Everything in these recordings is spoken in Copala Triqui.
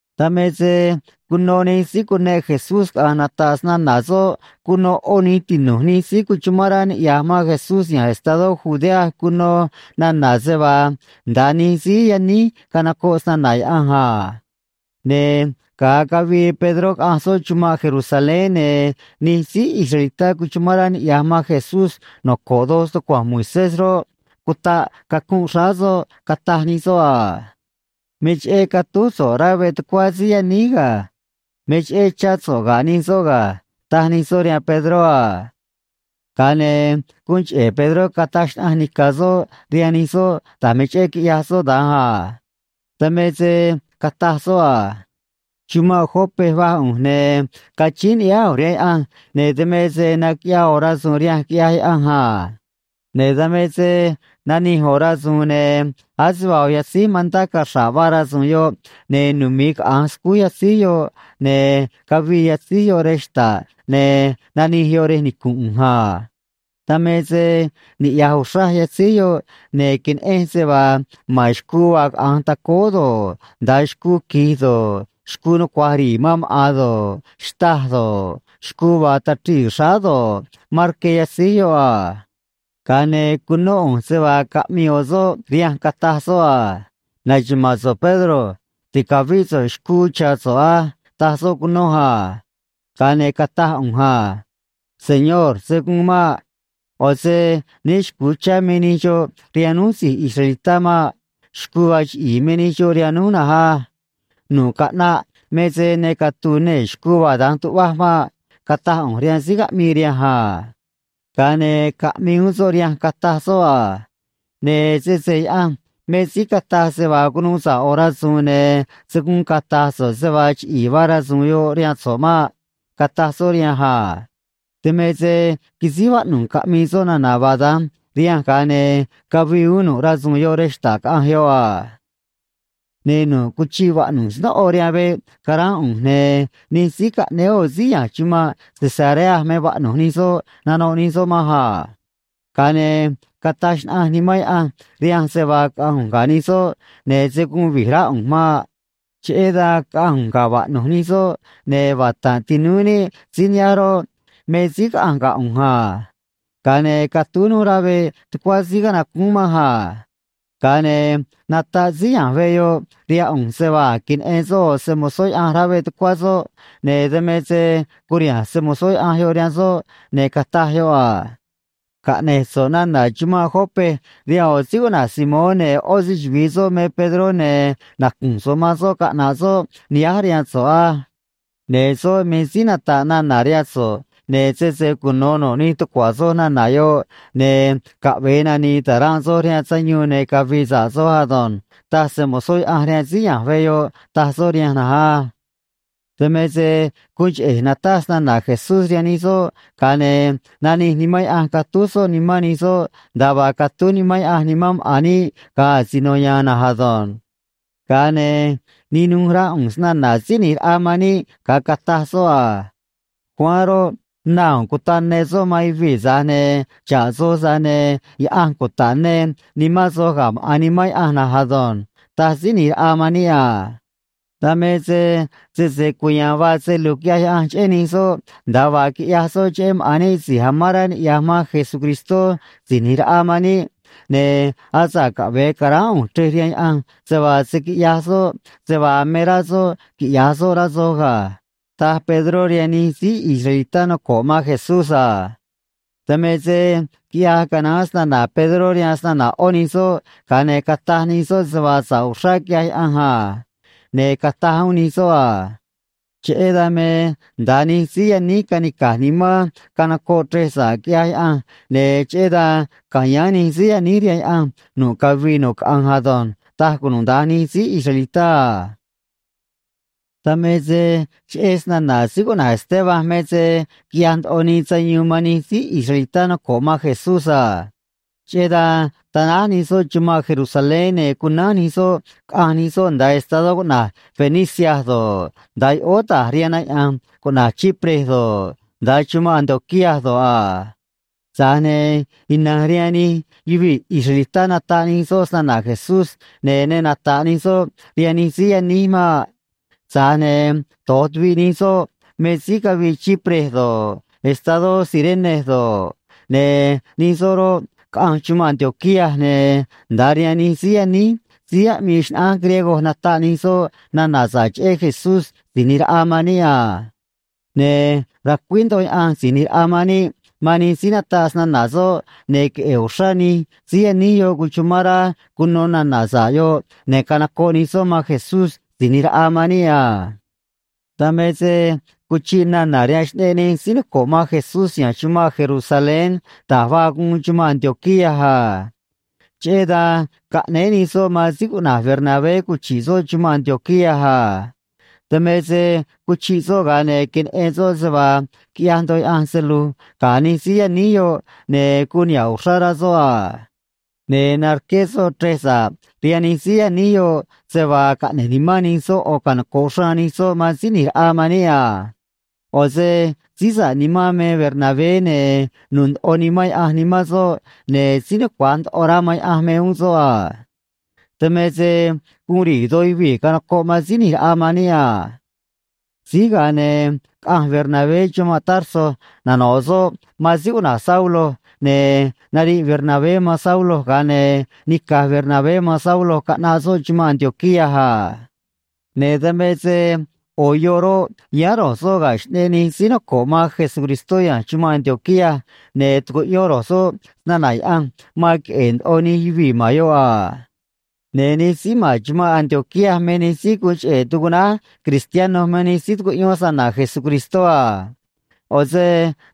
Dan me se cuno nij síí cuneꞌ Jesús caꞌa̱nj nata̱ꞌ snana̱ soꞌ cuno ꞌó nij tinu̱j nij síí cuchumán rá niꞌya̱j man Jesús ya̱nj estadó Judea cuno nana̱ se vaa nda̱a nij síí yaníj canocoꞌ snana̱ Yaꞌanj a. Ne̱ ga̱a cavii Pedró caꞌanj soꞌ chumanꞌ Jerusalén, ne̱ nij síí israelitá cuchumán rá niꞌya̱j man Jesús noco̱ꞌ doj stucua̱nj Moisés roꞌ, cutaꞌ cacunꞌ xráá soꞌ, cataj nij soꞌ a: ―Me cheꞌé catúj so̱ꞌ rá veꞌ tucuá síí yaníj ga̱. Me cheꞌé chá so̱ꞌ ga̱ nij soꞌ ga̱ ―taj nij soꞌ rihaan Pedró a. Ga̱a ne̱ guun cheꞌe̱ Pedró cataj xnaꞌanj nica̱ soꞌ rihaan nij soꞌ da̱j me cheꞌé quiꞌyaj soꞌ da̱nj a. Dan me se cataj soꞌ a: ―Chumanꞌ Jope va̱j ꞌu̱nj, ne̱ cachíín ni̱ꞌyáá ꞌu̱nj rihaan Yaꞌanj, ne̱ dan me se naquiꞌyaa ꞌo̱ rasu̱u̱n rihanj, quiꞌyaj Yaꞌanj a. Ne̱ dan me se nanij ꞌo̱ rasu̱u̱n, ne̱ ase vaa ꞌo̱ yatzíj mantá caxra̱ꞌ vaa rasu̱u̱n yoꞌ, ne̱ numi̱i caꞌa̱nj scúj yatzíj yoꞌ, ne̱ cavii yatzíj yoꞌ rej xta̱ꞌ, ne̱ nanij yoꞌ rej nicu̱nꞌ ꞌu̱nj a. Dan me se niꞌya̱j uxraj yatzíj yoꞌ, ne̱ queneꞌenj se vaa ma̱n xcuu vaa caꞌa̱nj tacóó do̱ꞌ, nda̱a xcuu quij do̱ꞌ, xcuu nucua̱j ri̱i̱ man maꞌa̱n do̱ꞌ, xtâj do̱ꞌ, xcuu vaa tachrii̱ xráá do̱ꞌ, ma̱n rque yatzíj yoꞌ a. Ga̱a ne̱ cunó ꞌu̱nj se vaa caꞌmii ꞌo̱ soꞌ rihanj, cataj soꞌ a: “Na̱xuma̱a̱n so̱ꞌ, Pedro. Ti̱cavíꞌ so̱ꞌ xcuu cha̱ so̱ꞌ á”, taj soꞌ cunoj a. Ga̱a ne̱ cataj ꞌu̱nj a: “Señor, se̱ guun maꞌ. ꞌO̱ se né xcu̱u chá me nij xoꞌ rihaan núj si̱j israelitá maꞌ. Xcuu vaa chiꞌi̱i̱ me nij xoꞌ rihaan núj na̱nj á. Nu̱ꞌ caꞌnaꞌ me se ne catu̱u̱ nee̱ xcuu vaa da̱nj tuꞌvaj maꞌ”, cataj ꞌu̱nj rihaan síí caꞌmii rihanj a. Ga̱a ne̱ caꞌmii uún soꞌ rihanj, cataj soꞌ a: “Ne̱ sese Yaꞌanj me síí cataj se vaa cunuu sa̱ꞌ ꞌo̱ rasu̱u̱n, ne̱ se̱ guun cata̱j so̱ꞌ se vaa chiꞌi̱i̱ vaa rasu̱u̱n yoꞌ rihaan so̱ꞌ maꞌ”, cataj soꞌ rihanj a. Dan me se quisíj vaꞌnu̱j caꞌmii soꞌ nana̱ vaa da̱nj rihanj, ga̱a ne̱ cavii uún nu̱ꞌ rasu̱u̱n yoꞌ rej xta̱ꞌ, caꞌanj yoꞌ a. ’Ne̱ nu̱ꞌ cuchiꞌ vaꞌnu̱j snóꞌo rihaan veꞌ caránꞌ ꞌu̱nj, ne̱ nij síí caꞌnéé ꞌo̱ síí ya̱nj chumanꞌ Cesarea me vaꞌnu̱j nij soꞌ, nanoꞌ nij soꞌ manj a. Ga̱a ne̱ cataj xnaꞌanj Nimán Yaꞌanj rihanj se vaa caꞌa̱nj ꞌu̱nj ga̱ nij soꞌ, ne̱ se̱ guun vi̱j rá ꞌu̱nj maꞌ. Cheꞌé dan caꞌanj ꞌu̱nj ga̱ vaꞌnu̱j nij soꞌ, ne̱ vata̱nꞌ tinúú níꞌ síí nihánj roꞌ, me síí caꞌanj ga̱ ꞌu̱nj a. Ga̱a ne̱ catúj núj rá veꞌ tucuá síí canacúún manj a. Ga̱a ne̱ nataꞌ síí ya̱nj veꞌ yoꞌ rihaan ꞌu̱nj se vaa a̱j queneꞌen soꞌ ꞌo̱ se‑mo̱zó Yaꞌanj rá veꞌ tucuá soꞌ, ne̱ dan me se curiha̱nj se‑mo̱zó Yaꞌanj yoꞌ rihaan soꞌ, ne̱ cataj yoꞌ a: “Caꞌne̱j so̱ꞌ nana̱ chumanꞌ Jope rihaan ꞌo̱ síí cuꞌna̱j Simón ne̱ ꞌó se‑chuvi̱i soꞌ me Pedró, ne̱ nacu̱nj so̱ꞌ man soꞌ caꞌna̱ꞌ soꞌ nihánj rihaan so̱ꞌ á. Ne̱ soꞌ me síí nata̱ꞌ nana̱ rihaan so̱ꞌ, ne̱ sese cuno̱ nu̱ꞌ nij tucua̱ soj nana̱ yoꞌ, ne̱ caꞌve̱e nani̱i̱ ta̱ranꞌ soj rihaan sayuun ne̱ cavi̱i̱ sa̱ꞌ soj ado̱nj”, taj se‑mo̱zó Yaꞌanj rihaan síí ya̱nj veꞌ yoꞌ, taj soꞌ rihanj na̱nj á. ’Dan me se guun cheꞌe̱j nataj snana̱ Jesús rihaan nij soꞌ, ga̱a ne̱ nanij Nimán Yaꞌanj catúj soꞌ nimán nij soꞌ nda̱a vaa catúj Nimán Yaꞌanj nimán maꞌa̱n níꞌ ga̱a asino ya̱a̱n na̱nj ado̱nj. Ga̱a ne̱ ninuj rá ꞌu̱nj snana̱ Síí ꞌNi̱j Raꞌa man níꞌ ga̱a cataj soꞌ a: “Juan roꞌ, na u̱u̱n cutaꞌ ne soꞌ man yuvii̱, tza̱j ne̱ xa̱ꞌ soj, tza̱j ne̱ Yaꞌanj cuta̱ꞌ ne nimán soj ga̱ maꞌa̱n Nimán Yaꞌanj na̱nj ado̱nj”, taj Síí ꞌNi̱j Raꞌa man níꞌ a. Dan me se sese cuya̱a̱n vaa se lu̱j quiꞌyaj Yaꞌanj cheꞌé nij soꞌ nda̱a vaa quiꞌyaj soꞌ cheꞌé maꞌa̱n níꞌ si̱j amán rá niꞌya̱j man Jesucristó Si̱j ꞌNi̱j Raꞌa man níꞌ, ne̱ asa̱ꞌ caꞌve̱e ca̱ráán ꞌu̱nj chrej rihaan Yaꞌanj se vaa se̱ quiꞌyaj soꞌ se vaa me rá soꞌ quiꞌya̱j soꞌ, rá soj ga̱ ―taj Pedró rihaan nij síí israelitá noco̱ꞌ man Jesús a. Dan me se quiꞌyaj canaán snana̱ Pedró rihaan snana̱ ꞌó nij soꞌ, ga̱a ne̱ cataj nij soꞌ se vaa sa̱ꞌ uxrá quiꞌyaj Yaꞌanj a. Ne̱ cataj uún nij soꞌ a: ―Cheꞌé dan me nda̱a nij síí yaníj canica̱j nimán canocoꞌ chrej sa̱ꞌ, quiꞌyaj Yaꞌanj, ne̱ cheꞌé dan ca̱yáán nij síí yaníj rihaan Yaꞌanj nu̱ꞌ cavii nu̱ꞌ caꞌanj ado̱nj ―taj cunuda̱nj nij síí israelitá a. Dan me se cheꞌé snana̱ síí cuꞌna̱j Esteban me se quiꞌyaj ndoꞌo nii sayuun man nij síí israelitá noco̱ꞌ man Jesús a. Cheꞌé dan tanáj nij soꞌ chumanꞌ Jerusalén, ne̱ cunánj nij soꞌ caꞌanj nij soꞌ nda̱a estadó cuꞌna̱j Fenicia do̱ꞌ, nda̱a yoꞌóó ta̱j rihaan na yaꞌa̱nj cuꞌna̱j Chipre do̱ꞌ, nda̱a chumanꞌ Antioquía do̱ꞌ a. Tza̱j ne̱ ina̱nj rihaan nij yuvii̱ israelitá nataꞌ nij soꞌ snana̱ Jesús, ne̱ ne nata̱ꞌ nij soꞌ rihaan nij síí yaníj maꞌ. Tza̱j ne̱ do̱j tuviꞌ nij soꞌ me síí cavii Chipre do̱ꞌ, estadó Cirene do̱ꞌ, ne̱ nij soꞌ roꞌ, caꞌanj chumanꞌ Antioquía, ne̱ nda̱a rihaan nij síí yaníj síí aꞌmii xnaꞌánj griego nataꞌ nij soꞌ nana̱ sa̱ꞌ cheꞌé Jesús Si̱j ꞌNi̱j Raꞌa man níꞌ a. Ne̱ racuíj ndoꞌo Yaꞌanj Si̱j ꞌNi̱j Raꞌa man níꞌ man nij síí nataꞌ snana̱ soꞌ, ne̱ queꞌe̱e̱ uxrá nij síí yaníj yoꞌ cuchumán rá cuno nana̱ sa̱ꞌ yoꞌ, ne̱ canocoꞌ nij soꞌ man Jesús Si̱j ꞌNi̱j Raꞌa man níꞌ a. Dan me se cuchiꞌ nana̱ rihaan xꞌneꞌ nij síí noco̱ꞌ man Jesús ya̱nj chumanꞌ Jerusalén da̱j vaa guun chumanꞌ Antioquía a. Cheꞌé dan caꞌnéé nij soꞌ man síí cuꞌna̱j Bernabé cuchi̱ꞌ soꞌ chumanꞌ Antioquía a. Dan me se cuchiꞌ soꞌ, ga̱a ne̱ queneꞌen soꞌ se vaa quiꞌyaj ndoꞌo Yaꞌanj se lu̱j ga̱ nij síí yaníj yoꞌ, ne̱ guun niha̱ꞌ uxrá rá soꞌ a. Ne̱ narqué soꞌ chrej sa̱ꞌ rihaan nij síí yaníj yoꞌ se vaa caꞌne̱j nimán nij soꞌ ꞌo̱ canoco̱ꞌ xraan nij soꞌ man Síí ꞌNi̱j Raꞌa man níꞌ a. ꞌO̱ se síí sa̱ꞌ nimán me Bernabé, ne̱ nu̱u̱ ndoꞌo Nimán Yaꞌanj nimán soꞌ, ne̱ síí nucua̱j ndoꞌo rá man Yaꞌanj me uún soꞌ a. Dan me se guun ri̱i̱ doj yuvii̱ canocoꞌ man Síí ꞌNi̱j Raꞌa man níꞌ a. Síj ga̱a ne̱ caꞌanj Bernabé chumanꞌ Tarso, nano̱ꞌ soꞌ man síí cuꞌna̱j Saulo, ne̱ nariꞌ Bernabé man Saulo, ga̱a ne̱ nica̱j Bernabé man Saulo caꞌnaꞌ soꞌ chumanꞌ Antioquía a. Ne̱ dan me se ꞌo̱ yoꞌ roꞌ, yáán ro̱j soꞌ ga̱ xꞌneꞌ nij síí noco̱ꞌ man Jesucristó ya̱nj chumanꞌ Antioquía, ne̱ tucuꞌyón ro̱j soꞌ snana̱ Yaꞌanj man queꞌe̱e̱ ndoꞌo nij yuvii̱ ma̱n yoꞌ a. Ne̱ nij síí ma̱n chumanꞌ Antioquía me nij síí guun cheꞌe̱ tucuꞌnáj “cristiano” man nij síí tucuꞌyón snana̱ Jesucristó a. ꞌO̱ se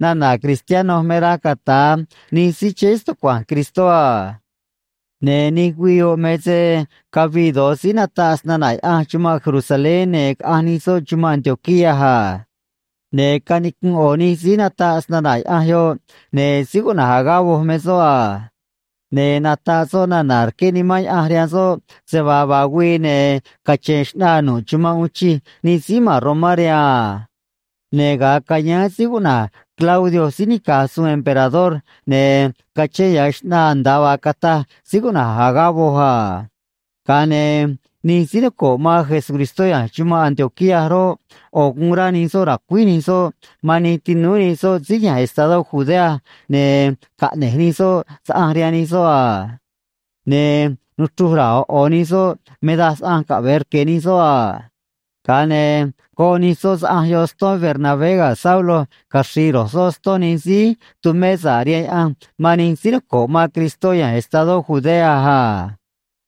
nana̱ “cristiano” me raj cata̱a nij síí chéé stucua̱nj Cristó a. Ne̱ nij güii yoꞌ me se cavii do̱j síí nataꞌ snana̱ Yaꞌanj chumanꞌ Jerusalén, ne̱ caꞌanj nij soꞌ chumanꞌ Antioquía a. Ne̱ canicunꞌ ꞌo̱ nij síí nataꞌ snana̱ Yaꞌanj yoꞌ, ne̱ síí cuꞌna̱j Agabo me soꞌ a. Ne̱ nataꞌ soꞌ nana̱ rqué Nimán Yaꞌanj rihaan soꞌ se vaa vaa güii, ne̱ cache̱n xꞌnaa nu̱ꞌ chumanꞌ uun chij nij síí ma̱n Romá rihaan a. Ne̱ ga̱a cayáán síí cuꞌna̱j Claudio síí nica̱j suun emperador, ne̱ cachén ya̱ xꞌnaa nda̱a vaa cataj síí cuꞌna̱j Agabo a. Ga̱a ne̱ nij síí noco̱ꞌ man Jesucristó ya̱nj chumanꞌ Antioquía roꞌ, ꞌo̱ guun rá nij soꞌ ra̱cuíj nij soꞌ man nij tinúú nij soꞌ síí ya̱nj estado Judea, ne̱ caꞌne̱j nij soꞌ saꞌanj rihaan nij soꞌ a. Ne̱ nuchruj ra̱a̱ ꞌo̱ ꞌo̱ nij soꞌ me daj saꞌanj caꞌve̱e rque̱ nij soꞌ a. Ga̱a ne̱ goꞌ nij soꞌ saꞌanj yoꞌ ston Bernabé ga̱ Saulo, caxri̱i̱ ro̱j soꞌ ston nij síí tumé sa̱ꞌ rihaan Yaꞌanj man nij síí noco̱ꞌ man Cristó ya̱nj estadó Judea a.